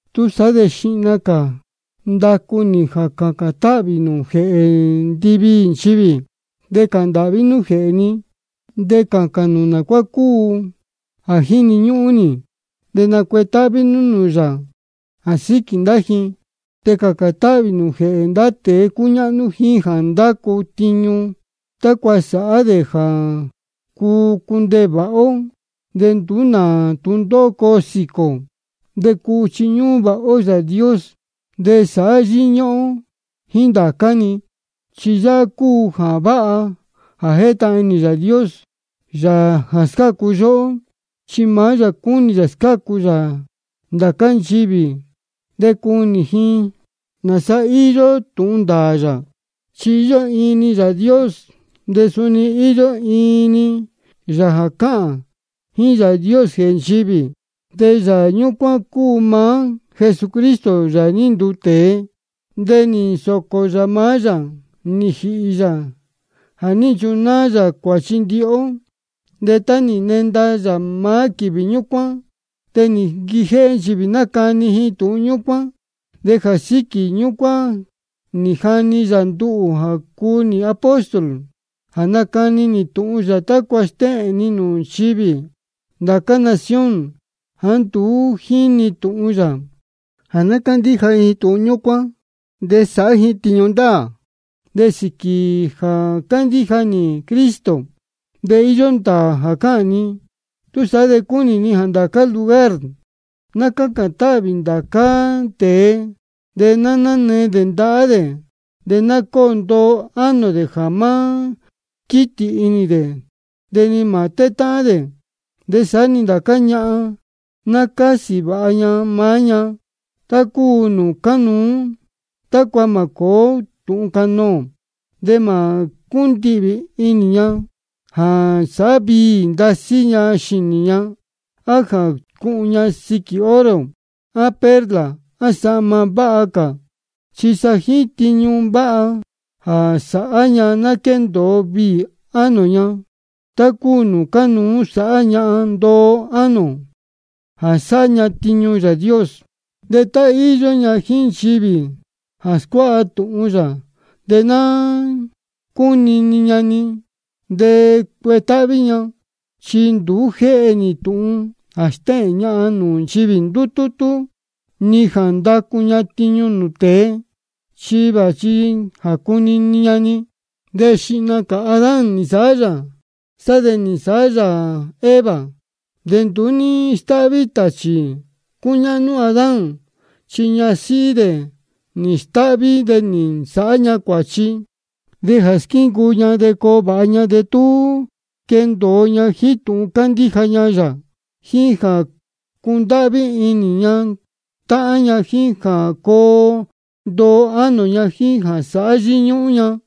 Túsaá de xihna cā ndácu nī jā cācān táhvī nū jēhē ndiviī nchivī. De cāhān ndāhví nú jēhē ji, de cācān nū nā cuá cúu jā jíni ñúhún ji, de nacuetáhví nú nūū yā jā síquī ndá ji. De cācān táhvī nū jēhē ndá tēe cúñáhnú jíín jā ndácu tiñu, tácua sāhá dē jā cuu cundeē vāha ó de nduú nā tūndóhó coo sīquī ō, de cuu chiñúhún vāha ó Yāā Dios de sāhá yíñúhún ó jíín ndācá-ni. Chi yáhá cúu jā váha jā jétahān inī Yāā Dios, Yāā jā scácu yóhó. Chi maá yā cúnī yā scácu yā ndācá nchivī de cunī ji nāsa íyó tūhun ndāā yā. Chi íyó iin-ni Yāā Dios, de suni íyó iin-ni Yāā jā cáhān jíín Yāā Dios jēhē nchivī. De Yāā ñúcuán cúu maá Jesucristo jā ní nduu tēe. De nī nsōcō yā maá yā nī jīhī yā jā ní nchunáá yā cuāchi ndihi ó. De tá nī nquenda maá quīvī ñúcuán, de nī nquijéhé nchivī nácani ji tūhun ñúcuán. De jā síquī ñúcuán nī jani yā nduhū jā cúu nī apóstol jā nácani nī tūhun yā, tácua stéhēn ni nūū nchivī ndācá nación jāá nduú jínī tūhun yā, jā ná cándíja ji tūhun ñúcuán de sāhá ji tiñu ndāā. De sīquī jā cándíja nī Cristo de íyó ndāā jā cáhān ni. Túsaá de cúnī ni jā ndācá-ni lugar ná cácān táhvī ndācá tēe, de nanee dē ndahá dē. De ná cóo ndoo ánō dē jā má quítī inī dē de ni mā tétáhán dē. De saá-ni ndācá ñahan, ná cásī vāha ña maá ña tá cúu nūū cánuú, tácua mā cōó tūhun canoō. De mā cúndihvī inī ña jā sāhá viī ndasí ña xīnī ña, á jā cuhun ña siquī oro á perla á sahma váha cā. Chi sa jíín tiñu váha jā sáhá ña ná quéndōo viī ánō ña, tá cúu nūū cánuú sāhá ñahan ndoo ánō jā sáhá ña tiñu Yāā Dios. De tá íyó ña jíín nchivī jā scuáha tūhun yā, de ná cúnini ña-ni de cuetáhví ña. Chi nduú jéhe nī tūhun jā stéhēn ñahan nūū nchivī ndútútú, ni jā ndacu ña tiñu nūū tēe. Chi vāchi jā cunini ña-ni. Chi xihna cā Adán nī nsāhá yā, de sá de nī nsāhá yā Eva. De nduú ní stáhví tāchī cúñáhnú Adán, chi sa ñasíhí dē nī stáhví, de nī nsāhá ña cuāchi. De jā scácu ndá ña sēhe de coo vāha ña, de tú quendōo ña jíín tūhun cándíja ña yā, jíín jā cundáhví inī ña táhán ña, jíín jā coo ndoo ánō ña, jíín jā sāhá yíñúhún ña.